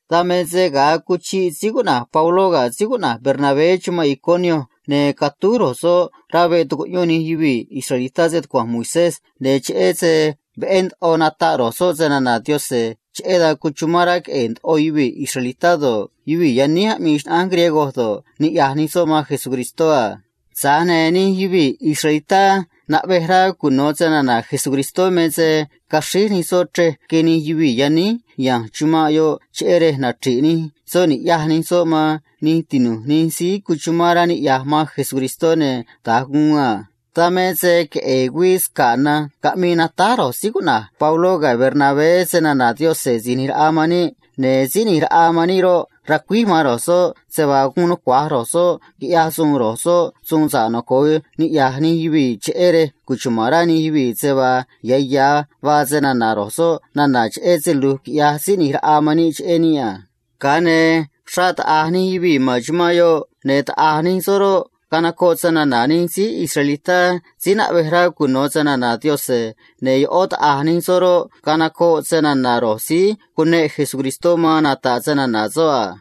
Dan me se ga̱a cuchiꞌ síí cuꞌna̱j Pabló ga̱ síí cuꞌna̱j Bernabé chumanꞌ Iconio, ne̱ catúj ro̱j soꞌ rá veꞌ tucuꞌyón nij yuvii̱ israelitá stucua̱nj Moisés nda̱a vaa uꞌyón ro̱j soꞌ ꞌyaj ro̱j soꞌ a. Ne̱ cheꞌé se veꞌé ndoꞌo nataꞌ ro̱j soꞌ snana̱ Yaꞌanj, cheꞌé dan cuchumán rá queꞌe̱e̱ uxrá yuvii̱ israelitá do̱ꞌ, yuvii̱ yaníj aꞌmii xnaꞌánj griego do̱ꞌ, niꞌya̱j nij soꞌ man Jesucristó a. Tza̱j ne̱ nij yuvii̱ israelitá naꞌvej rá cuno̱ snana̱ Jesucristó me se caxríj nij soꞌ chrej rque nij yuvii̱ yaníj ya̱nj chumanꞌ yoꞌ cheꞌé rej nachri̱ꞌ nij soꞌ ni̱ꞌyaj nij soꞌ man nij tinu̱j nij síí cuchumán rá niꞌya̱j man Jesucristó, ne̱ da̱nj guun a. Dan me se queꞌe̱e̱ güii sca̱ꞌ na̱nj caꞌmii natáj Pabló ga̱ Bernabé snana̱ Yaꞌanj Si̱j ꞌNi̱j Raꞌa man níꞌ a. Ne̱ Síí ꞌNi̱j Raꞌa man níꞌ roꞌ, racuíj man ro̱j soꞌ se vaa guun nucua̱j ro̱j soꞌ quiꞌyaj ndoꞌo ro̱j soꞌ suun sa̱ꞌ noco̱o niꞌya̱j nij yuvii̱, cheꞌé rej cuchuma̱n rá nij yuvii̱ se vaa ya̱ ya̱ vaa snana̱ ro̱j soꞌ nana̱ cheꞌé se lu̱j quiꞌyaj Síí ꞌNi̱j Raꞌa man níꞌ cheꞌé níꞌ a. Ga̱a ne̱ xraꞌ taꞌa̱j nij yuvii̱ ma̱n chumanꞌ yoꞌ a. ꞌO̱ se taꞌa̱j nij soꞌ roꞌ, canocoꞌ snana̱ nij síí israelitá síí naꞌvej rá cuno̱ snana̱ Yaꞌanj, ne̱ ꞌó taꞌa̱j nij soꞌ roꞌ, canocoꞌ snana̱ ro̱j síí cuneꞌ Jesucristó caꞌa̱nj nata̱ꞌ snana̱ soꞌ a.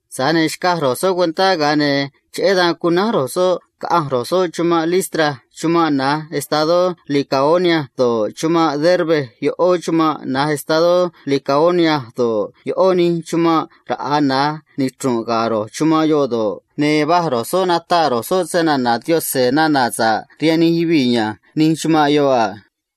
Tza̱j ne̱ xcaj ro̱j soꞌ cuentá, ga̱a ne̱ cheꞌé dan cunánj ro̱j soꞌ, caꞌanj ro̱j soꞌ chumanꞌ Listra chumanꞌ na̱j estadó Licaonia do̱ꞌ, chumanꞌ Derbe ꞌó chumanꞌ na̱j estadó Licaonia do̱ꞌ, ꞌó nij chumanꞌ raꞌa̱ na̱j nichru̱nꞌ ga̱ ro̱j chumanꞌ yoꞌ do̱ꞌ, ne̱ va̱j ro̱j soꞌ nataꞌ ro̱j soꞌ nana̱ sa̱ꞌ cheꞌé Jesucristó rihaan nij yuvii̱ ya̱nj nij chumanꞌ yoꞌ a.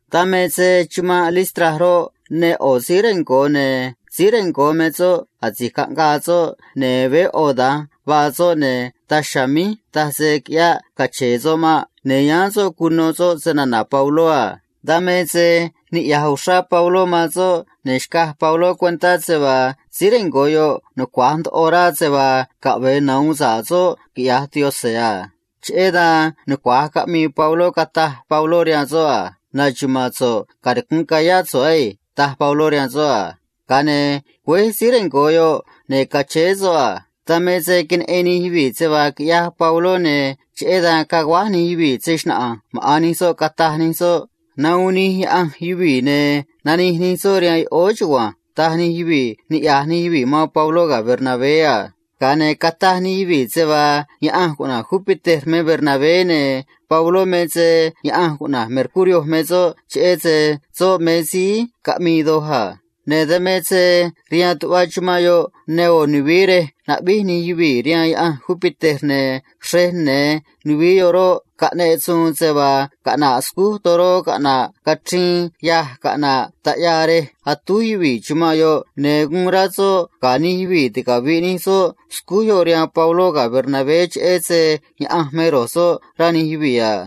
Dan me se chumanꞌ Listra roꞌ, ne ꞌo̱ síí rengo̱ ne̱ síí rengo̱ me soꞌ asi̱j caꞌngaa soꞌ, ne̱ veé ꞌo̱ da̱nj vaa soꞌ, ne̱ daj chiha̱a̱ míj taj se quiꞌyáꞌ cache̱e̱ soꞌ maꞌ. Ne̱ yáán soꞌ cuno soꞌ snana̱ Pabló a. Dan me se niꞌya̱j uxrá Pabló man soꞌ, ne̱ xcaj Pabló cuentá se vaa síí rengo̱ yoꞌ me se nucua̱j rá se vaa caꞌve̱e nahu̱un sa̱ꞌ soꞌ, quiꞌya̱j Yaꞌanj a. Cheꞌé dan nucua̱j caꞌmii Pabló, cataj Pabló rihaan soꞌ a: ―Na̱xuma̱a̱n so̱ꞌ, canicu̱nꞌ ca̱yá so̱ꞌ á ―taj Pabló rihaan soꞌ a. Ga̱a ne̱ güéj síí rengo̱ yoꞌ, ne̱ cachéé soꞌ a. Dan me se queneꞌen nij yuvii̱ se vaa quiꞌyaj Pabló, ne̱ cheꞌé dan caguáj nij yuvii̱ se‑xnaꞌa̱nj maꞌa̱n nij soꞌ, cataj nij soꞌ a: ―Nahuun nij yaꞌanj yuvii̱, ne̱ nanij nij soꞌ rihaan yoꞌóó chugua̱nj ―taj nij yuvii̱ niꞌya̱j nij yuvii̱ man Pabló ga̱ Bernabé a. Ga̱a ne̱ cataj nij yuvii̱ se vaa yaꞌanj cuꞌna̱j Júpiter me Bernabé, ne̱ Pabló me se yaꞌanj cuꞌna̱j Mercurio me soꞌ, cheꞌé se soꞌ me síí caꞌmii doj a. Ne̱ dan me se rihaan tuꞌva chumanꞌ yoꞌ ne ꞌo̱ nuvií rej aráj gue̱e̱ nij yuvii̱ rihaan yaꞌanj Júpiter, ne̱ xrej ya̱nj nuvií yoꞌ roꞌ, caꞌneꞌ suun se vaa caꞌna̱ꞌ scúj toró caꞌna̱ꞌ cachriin yâj caꞌna̱ꞌ taꞌyaa rej atúj yuvii̱ chumanꞌ yoꞌ, ne̱ guun rá soꞌ ga̱ nij yuvii̱ ticavi̱ꞌ nij soꞌ scúj yoꞌ rihaan Pabló ga̱ Bernabé cheꞌé se yaꞌanj me ro̱j soꞌ rá nij yuvii̱ a.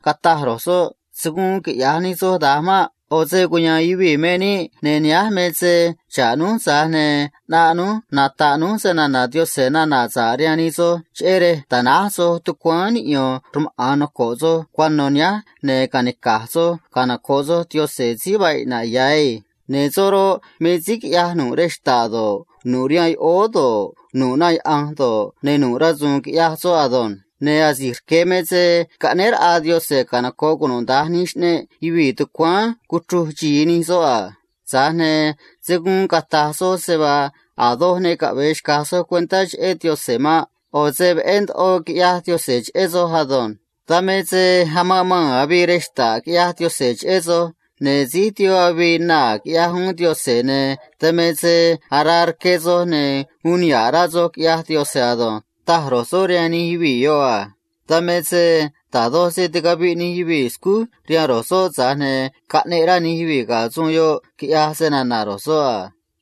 cataj ro̱j soꞌ a: ―Se̱ guun quiꞌya̱j nij soj da̱nj maꞌ. ꞌO̱ se cuya̱a̱n yuvii̱ me níꞌ, ne̱ nihánj me se ꞌnaꞌ núj nata̱ꞌ núj snana̱ Yaꞌanj nana̱ sa̱ꞌ rihaan nij soj, cheꞌé rej ta̱náj soj tucuáán niꞌyo̱n rmaꞌa̱n noco̱ꞌ soj cuano̱ nihánj ne̱ ca̱nica̱j soj canoco̱ꞌ soj Yaꞌanj síí vaa iꞌna̱ꞌ ya̱ na̱nj á. Ne̱ soꞌ roꞌ, me síí quiꞌyaj nu̱ꞌ rej xta̱ꞌ do̱ꞌ, nu̱ꞌ rihaan yoꞌóó do̱ꞌ, nu̱ꞌ na yaꞌa̱nj do̱ꞌ, ne̱ nu̱ꞌ rasu̱u̱n quiꞌyaj soꞌ ado̱nj. Ne̱ asi̱j rque̱ me se caꞌnéé raꞌa Yaꞌanj canoco̱ꞌ cunuda̱nj nij xꞌneꞌ yuvii̱ tucuáán cuchruj xi̱i nij soꞌ a. Tza̱j ne̱ se̱ guun cata̱j soj se vaa a̱ doj ne caꞌve̱e xca̱j soj cuentá cheꞌé Yaꞌanj maꞌ. ꞌO̱ se veꞌé ndoꞌo quiꞌyaj Yaꞌanj cheꞌé soj ado̱nj. Dan me se amanꞌ maa̱n avii rej xta̱ꞌ, ꞌyaj Yaꞌanj cheꞌé soj, ne̱ síj tiempó avii naa̱, ꞌyaj uún Yaꞌanj, ne̱ dan me se araa rque soj, ne̱ uun niha̱ꞌ rá soj, ꞌyaj Yaꞌanj ado̱nj ―taj ro̱j soꞌ rihaan nij yuvii̱ yoꞌ a. Dan me se da̱j doj se ticaviꞌ nij yuvii̱ scúj rihaan ro̱j soꞌ, tza̱j ne̱ caꞌneꞌ rá nij yuvii̱ ga̱ suun yoꞌ, quiꞌyaj snana̱ ro̱j soꞌ a.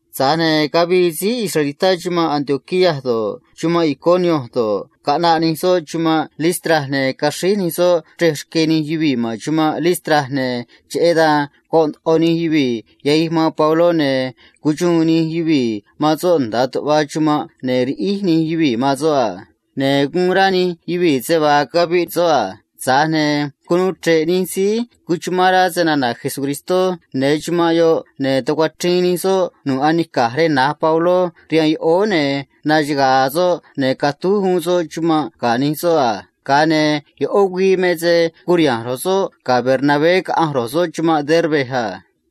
Tza̱j ne̱ cavii síí israelitá chumanꞌ Antioquía do̱ꞌ, chumanꞌ Iconio do̱ꞌ, caꞌnaꞌ nij soꞌ chumanꞌ Listra, ne̱ caxríj nij soꞌ chrej rque nij yuvii̱ ma̱n chumanꞌ Listra a. Ne̱ cheꞌé dan goꞌ ndoꞌo nij yuvii̱ yahij man Pabló, ne̱ cuxuun nij yuvii̱ man soꞌ nda̱a tuꞌva chumanꞌ, cheꞌé se guun rá nij yuvii̱ se vaa caviꞌ soꞌ a. Tza̱j ne̱ cunuu chre̱ꞌ nij síí noco̱ꞌ man Jesucristó ya̱nj chumanꞌ yoꞌ, ne̱ tucuachriin nij soꞌ nu̱ꞌ anica̱j rej na̱j Pabló rihaan yoꞌóó, ne̱ naxaga̱a̱ soꞌ, ne̱ catúj uún soꞌ chumanꞌ ga̱ nij soꞌ a. Ga̱a ne̱ ꞌó güii me se curiha̱nj ro̱j soꞌ ga̱ Bernabé caꞌanj ro̱j soꞌ chumanꞌ Derbe a.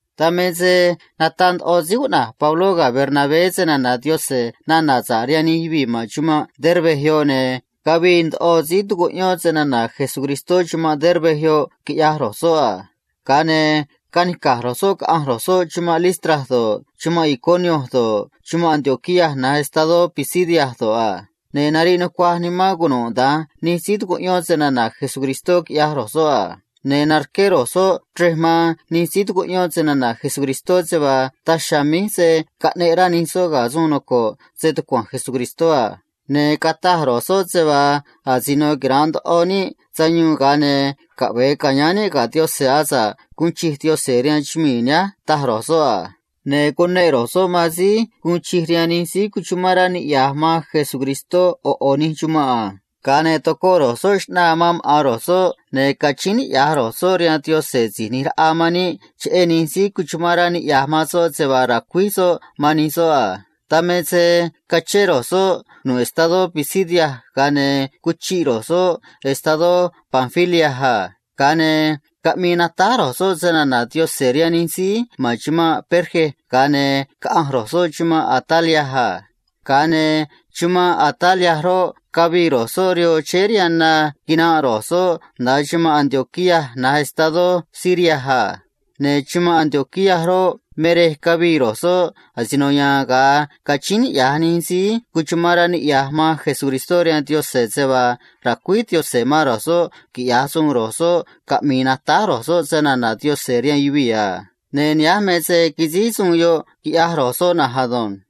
Dan me se nataꞌ ndoꞌo síí cuꞌna̱j Pabló ga̱ Bernabé nana̱ sa̱ꞌ cheꞌé Jesucristó rihaan nij yuvii̱ ma̱n chumanꞌ Derbe yoꞌ, ne̱ cavii ndoꞌo síí tucuꞌyón snana̱ Jesucristó chumanꞌ Derbe yoꞌ, quiꞌyaj ro̱j soꞌ a. Ga̱a ne̱ canica̱j ro̱j soꞌ, caꞌanj ro̱j soꞌ chumanꞌ Listra do̱ꞌ, chumanꞌ Iconio do̱ꞌ, chumanꞌ Antioquía na̱j estadó Pisidia do̱ꞌ a. Ne̱ nariꞌ nucuaj nimán cunuda̱nj nij síí tucuꞌyón snana̱ Jesucristó, quiꞌyaj ro̱j soꞌ a. Ne̱ narqué ro̱j soꞌ chrej nucua̱j man nij síí tucuꞌyón snana̱ Jesucristó se vaa daj chiha̱a̱ míj se̱ caꞌneꞌ rá nij soꞌ ga̱ suun noco̱ꞌ stucua̱nj Jesucristó a. Ne̱ cataj ro̱j soꞌ se vaa asino quira̱nꞌ ndoꞌo níꞌ sayuun, ga̱a ne̱ caꞌve̱e catu̱u̱ níꞌ ca̱yáán níꞌ ga̱ Yaꞌanj asa̱ꞌ guun chij Yaꞌanj, taj ro̱j soꞌ a. Ne̱ cuneꞌ ro̱j soꞌ man síí tu̱mé sa̱ꞌ rihaan Yaꞌanj man xꞌneꞌ nij síí noco̱ꞌ man Cristó ꞌo̱ ꞌo̱ nij chumanꞌ a. Ga̱a ne̱ tocoꞌ ro̱j soꞌ xꞌnaa man maꞌa̱n ro̱j soꞌ, ne̱ cachíín niꞌya̱j ro̱j soꞌ rihaan Jesucristó Si̱j ꞌNi̱j Raꞌa man níꞌ cheꞌé nij síí cuchumán rá niꞌya̱j man soꞌ se vaa ra̱cuíj soꞌ man nij soꞌ a. Dan me se cachén ro̱j soꞌ nu̱ꞌ estadó Pisidia, ga̱a ne̱ cuchiꞌ ro̱j soꞌ estadó Panfilia a. Ga̱a ne̱ caꞌmii natáj ro̱j soꞌ snana̱ Yaꞌanj rihaan nij síí ma̱n chumanꞌ Perge, ga̱a ne̱ nanij ro̱j soꞌ caꞌanj ro̱j soꞌ chumanꞌ Atalia a. Ga̱a ne̱ chumanꞌ Atalia roꞌ, cavii ro̱j soꞌ rihoo chéé rihaan na, quinanꞌ ro̱j soꞌ nda̱a chumanꞌ Antioquía na̱j estadó Siria a. Ne̱ chumanꞌ Antioquía roꞌ, me rej cavii ro̱j soꞌ asino ya̱a̱n ga̱a cachíín niꞌya̱j nij síí noco̱ꞌ man Jesucristó rihaan Yaꞌanj se vaa ra̱cuíj Yaꞌanj man ro̱j soꞌ quiꞌya̱j ro̱j soꞌ suun caꞌmi̱i̱ natáj snana̱ Yaꞌanj rihaan yuvii̱ a. Ne̱ nihánj me se quisíj suun yoꞌ, quiꞌyaj ro̱j soꞌ na̱nj ado̱nj.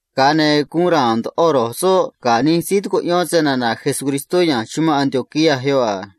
Ga̱a ne̱ guun ra̱a̱n ndoꞌo ro̱j soꞌ ga̱ nij síí tucuꞌyón snana̱ Jesucristó ya̱nj chumanꞌ Antioquía yoꞌ a.